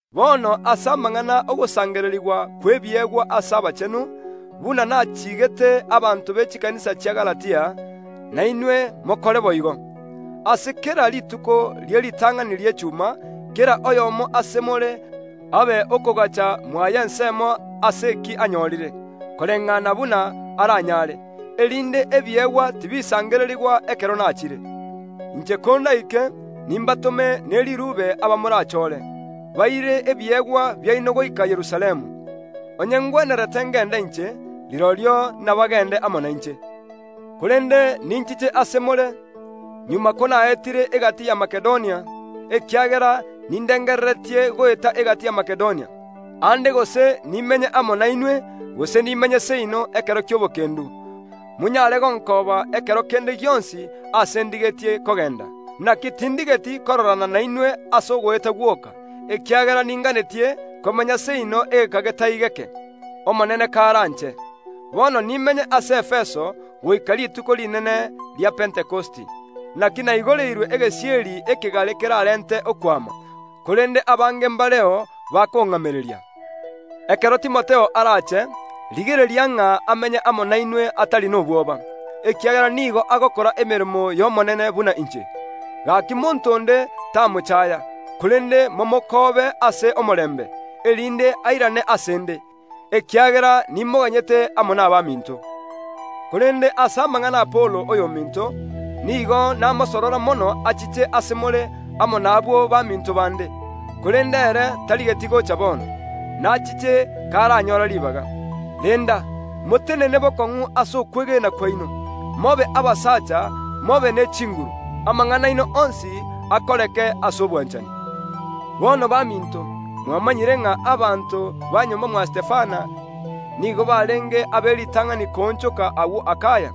Bono ase amang’ana y’ogosangererigwa kw’ebiegwa ase abachenu, buna nachiigete abanto be chikanisa chia Galatia, nainwe mokore boigo. Ase kera rituko rie ritang’ani ri’echuma, kera oyomo ase more abe okogaacha mwaye ensemo ase eki anyorire, koreng’ana buna aranyare, erinde ebiegwa tibisangererigwa ekero nachire. Inche kondaike nimbatome ne riruube aba morachore, baire ebiegwa biaino goika Yerusalemu. Onye ngwenerete ngende inche, rirorio nabagende amo nainche. Korende ninchiche ase more, magega konaetire egati ya Makedonia, ekiagera nindengereretie goeta egati ya Makedonia. Aande gose nimenye amo nainwe, gose nimenye seino ekero gi’etoigo, monyare gonkooba ekero kende gionsi aase ndigetie kogenda. Naki tindigeti kororana nainwe ase ogoeta gwoka, ekiagera ninganetie komenya seino egeka getari geke, Omonene karanche. Bono nimenye ase Efeso goika rituko rinene ria Pentekosti; naki naigoreirwe egesieri ekegare keraarente okwama, korende abange mbareo bakong’amereria. Ekero Timotheo arache, rigereria ng’a amenye amo nainwe atari nobwoba, ekiagera nigo agokora emeremo y’Omonene buna inche. Gaki monto onde tamochaya, korende momokoobe ase omorembe, erinde airane ase ’nde, ekiagera nimoganyete amo nabaminto. Korende ase amang’ana ’Apolo oyominto, nigo namosorora mono achiche ase more amo nabwo baminto bande, korende ere tarigeti gocha bono. Nachiche karanyore ribaga. Renda, motenene bokong’u ase okwegena kwaino, mobe abasacha, mobe ne chinguru. Amang’ana aino onsi akoreke ase obwanchani. Bono baminto, mwamanyire ng’a abanto ba nyomba mwa Stefana nigo barenge ab’eritang’ani koonchoka agwo Akaya;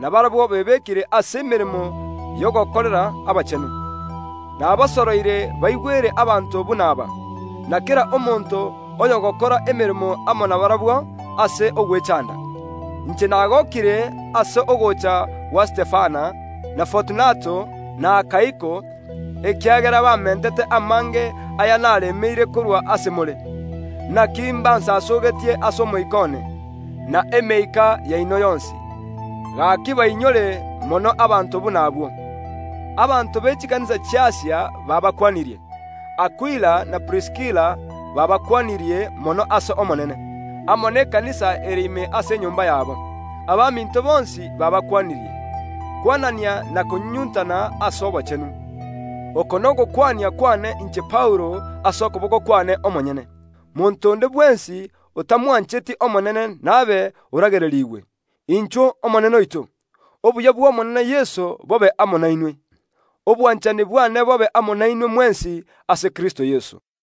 na barabwo bebekire ase emeremo y’ogokorera abachenu. Nabasoroire baigwere abanto buna aba, na kera omonto oyogokora emeremo amo nabarabwo ase ogwechanda. Inche nagokire ase ogocha gwa Stefana na Fortunato, na Akaiko, ekiagera bamentete amange aya naremeire korwa ase more. Naki mbansasogetie ase omoika one, na emeika yaino yonsi. Gaki bainyore mono abanto buna abwo. Abanto be chikanisa chi’Asia baabakwanirie. Akwila na Priskila baabakwanirie mono ase Omonene, amo n’ekanisa ere ime ase enyomba yabo. Abaminto bonsi baabakwanirie. Kwanania na konyunyuntana ase obochenu. Oko nogokwania kwane inche Paulo ase okoboko kwane omonyene. Monto onde bwensi otamwancheti Omonene nabe oragererigwe. Inchuo, Omonene oito! Obuya bw’Omonene Yeso bobe amo nainwe. Obwanchani bwane bobe amo nainwe mwensi ase Kristo Yeso. Amina.